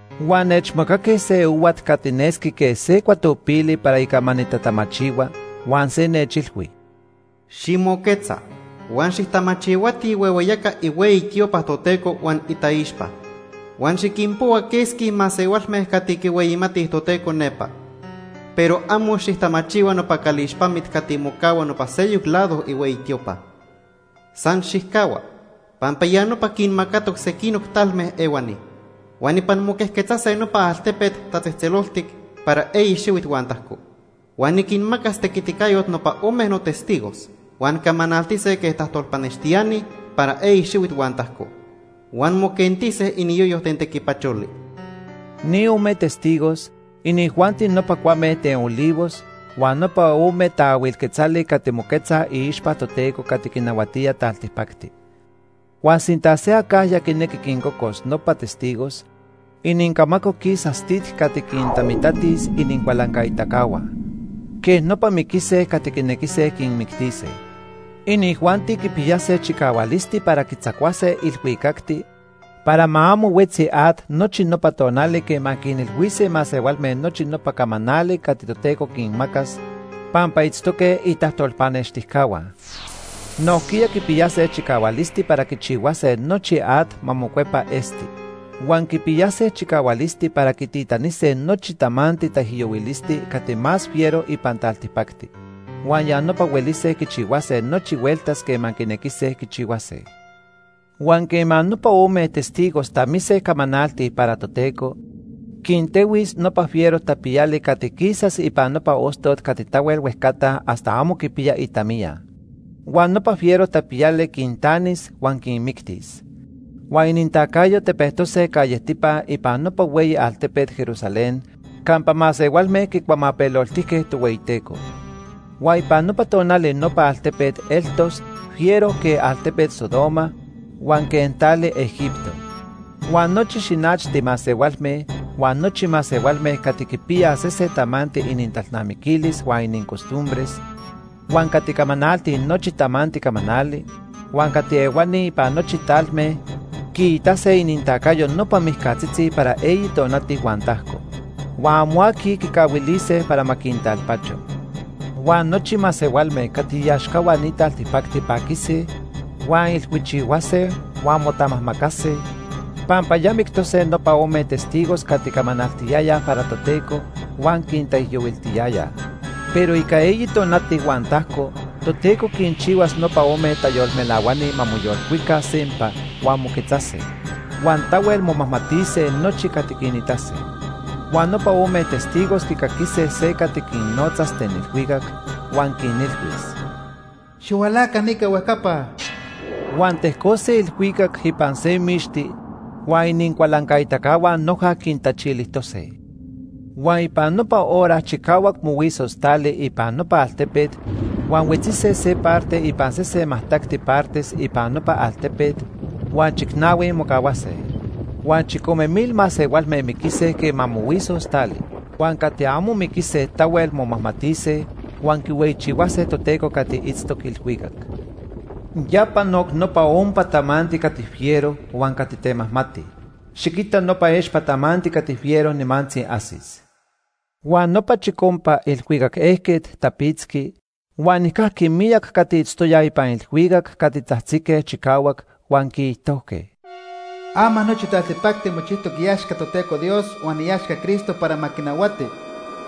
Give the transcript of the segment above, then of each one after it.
Huan nechmacaque se ohuat cati nesqui quej se cuatopili para ica ma nitatamachihua, huan se nechilhui: “Ximoquetza huan xijtamachihuati ihuehueyaca ihueyi tiopa Toteco huan itaixpa. Huan xiquinpohua quesqui masehualme cati quihueyimatij Toteco nepa. Pero amo xijtamachihua nopa calixpamit cati mocahua nopa seyoc lado ihueyi tiopa. San xijcahua, pampa ya nopa quinmacatoc sequinoc talme ehuani. Huan ipan moquejquetzase nopa altepet tatzejtzeloltic para eyi xihuit huan tajco. Huan niquinmacas tequiticayot nopa ome notestigos huan camanaltise quej tajtolpanextiani para eyi xihuit huan tajco. Huan moquentise iniyoyo ten tequipacholi.” Ni ome testigos, inijuanti nopa cuame ten olivos huan nopa ome taahuil quetzali cati moquetzaj iixpa Toteco cati quinahuatía taltipacti. Huan sinta se acajya quinequi quincocos nopa testigos, inincamaco quisas tit cati quintamitatis inincualancaitacahua. Quej nopa miquise cati quinequise quinmictise. Inijuanti quipiyase chicahualisti para quitzacuase ilhuicacti para ma amo huetzi at nochi nopa tonali quema quinilhuise masehualme nochi nopa camanali cati Toteco quinmacas pampa itztoque itajtolpanextijcahua. Nojquiya quipiyase chicahualisti para quichihuase nochi at ma mocuepa esti. Huan quipiyase chicahualisti para quititanise nochi tamanti taijyohuilisti cati más fiero ipan taltipacti. Huan ya nopa huelise quichihuase nochi hueltas quema quinequise quichihuase. Huan quema nopa ome testigos tamise camanaltij para Toteco, quintehuis nopa fiero tapiyali cati quisas ipan nopa ostot cati tahuel huejcata hasta amo quipiya itamiya. Huan nopa fiero tapiyali quintanis huan quinmictis. Huan inintacayo tepejtose callejtipa ipan nopa hueyi altepet Jerusalén campa masehualme quicuamapeloltijque Tohueyiteco. Huan ipan nopa tonali nopa altepet eltos fiero quej altepet Sodoma huan quej tali Egipto. Huan nochi xinachti masehualme, huan nochi masehualme cati quipiyaj sesen tamanti inintalnamiquilis huan inincostumbres, huan cati camanaltij nochi tamanti camanali, huan cati ehuani ipan nochi talme quiitase inintacayo nopa mijcatzitzi para eyi tonati huan tajco. Huan amo aqui quicahuilise para ma quintalpacho. Huan nochi masehualme cati iaxcahua ni taltipacti paquise, huan ilhuichihuase huan motamajmacase, pampa ya mictose nopa ome testigos cati camanaltiyayaj para Toteco huan quintaijyohuiltiyayaj. Pero ica eyi tonati huan tajco Toteco quinchihuas nopa ome tayolmelahuani ma moyolcuica sempa huan moquetzase. Huan tahuel momajmatise nochi cati quinitase. Huan nopa ome testigos quicaquise se cati quinnotzas ten ilhuicac, huan quinilhuis: “Xihualaca nica huejcapa.” Huan tejcose ilhuicac ipan se mixti, huan inincualancaitacahua noja quintachilijtose. Huan ipan nopa hora chicahuac mohuisos tali ipan nopa altepet huan huetzise se parte ipan sesen majtacti partes ipan nopa altepet huan chicnahui mocahuase. Huan chicome mil masehualme miquise quema mohuisos tali. Huan cati amo miquise tahuel momajmatise huan quihueyichihuase Toteco cati itztoc ilhuicac. Ya panoc nopa ompa tamanti cati fiero huan cati temajmati. Xiquita nopa expa tamanti cati fiero nimantzi ajsis. Huan nopa chicompa ilhuicac ejquet tapitzqui huan nijcajqui miyac cati itztoyaj ipan ilhuicac cati tzajtzique chicahuac, huan quiijtojque: “Ama nochi taltipacti mochijtoc iaxca Toteco Dios huan iaxca Cristo para ma quinahuati.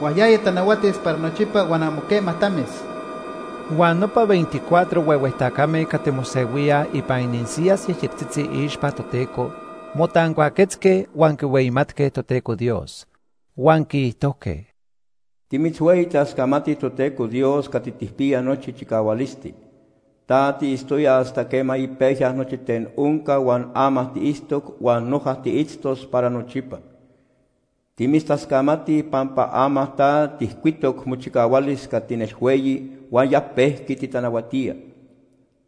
Huan yaya tanahuatis para nochipa huan amo quema tamis.” Huan nopa veinticuatro huehue tacame cati mosehuíaj ipan inisiyas yejyectzitzi iixpa Toteco motancuaquetzque huan quihueyimatque Toteco Dios. Huan quiijtojque: “Timitzhueyitascamatij Toteco Dios cati tijpiya nochi chicahualisti. Ta tiitztoya hasta quema ipejya nochi ten onca huan ama tiitztoc huan noja tiitztos para nochipa. Timitztascamatij pampa ama ta tijcuitoc mochicahualis cati nelhueyi huan ya pejqui titanahuatía.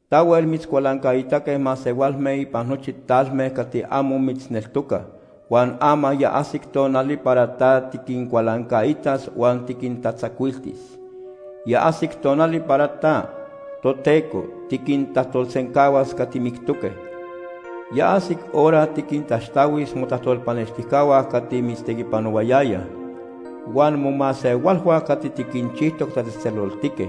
Tahuel mitzcualancaitaque masehualme ipan nochi talme cati amo mitzneltocaj, huan ama ya ajsic tonali para ta tiquincualancaitas huan tiquintatzacuiltis. Ya ajsic tonali para ta, Toteco, tiquintajtolsencahuas cati mictoque. Ya ajsic hora tiquintaxtahuis motajtolpanextijcahua cati mitztequipanohuayayaj, huan momasehualhua cati tiquinchijtoc tatzejtzeloltique.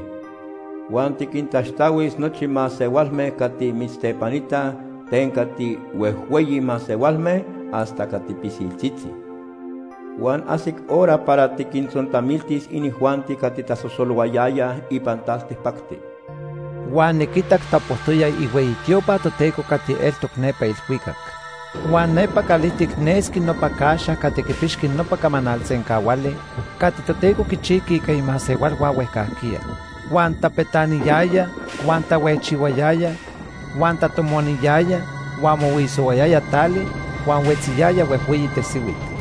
Huan tiquintaxtahuis nochi masehualme cati mitztepanitaj ten cati huejhueyi masehualme hasta cati pisiltzitzi. Huan ajsic hora para tiquintzontamiltis inijuanti cati tasosolohuayayaj ipan taltipacti.” Huan niquitac tapojtoya ihueyi tiopa Toteco cati eltoc nepa ilhuicac. Huan nepa calijtic nesqui nopa Caxa cati quipixqui nopa camanal sencahuali cati Toteco quichijqui ica imasehualhua huejcajquiya. Huan tapetaniyaya, huan tahuejchihuayaya, huan tatomoniyaya, huan mohuisohuayaya tali, huan huetziyaya huejhueyi tesihuit.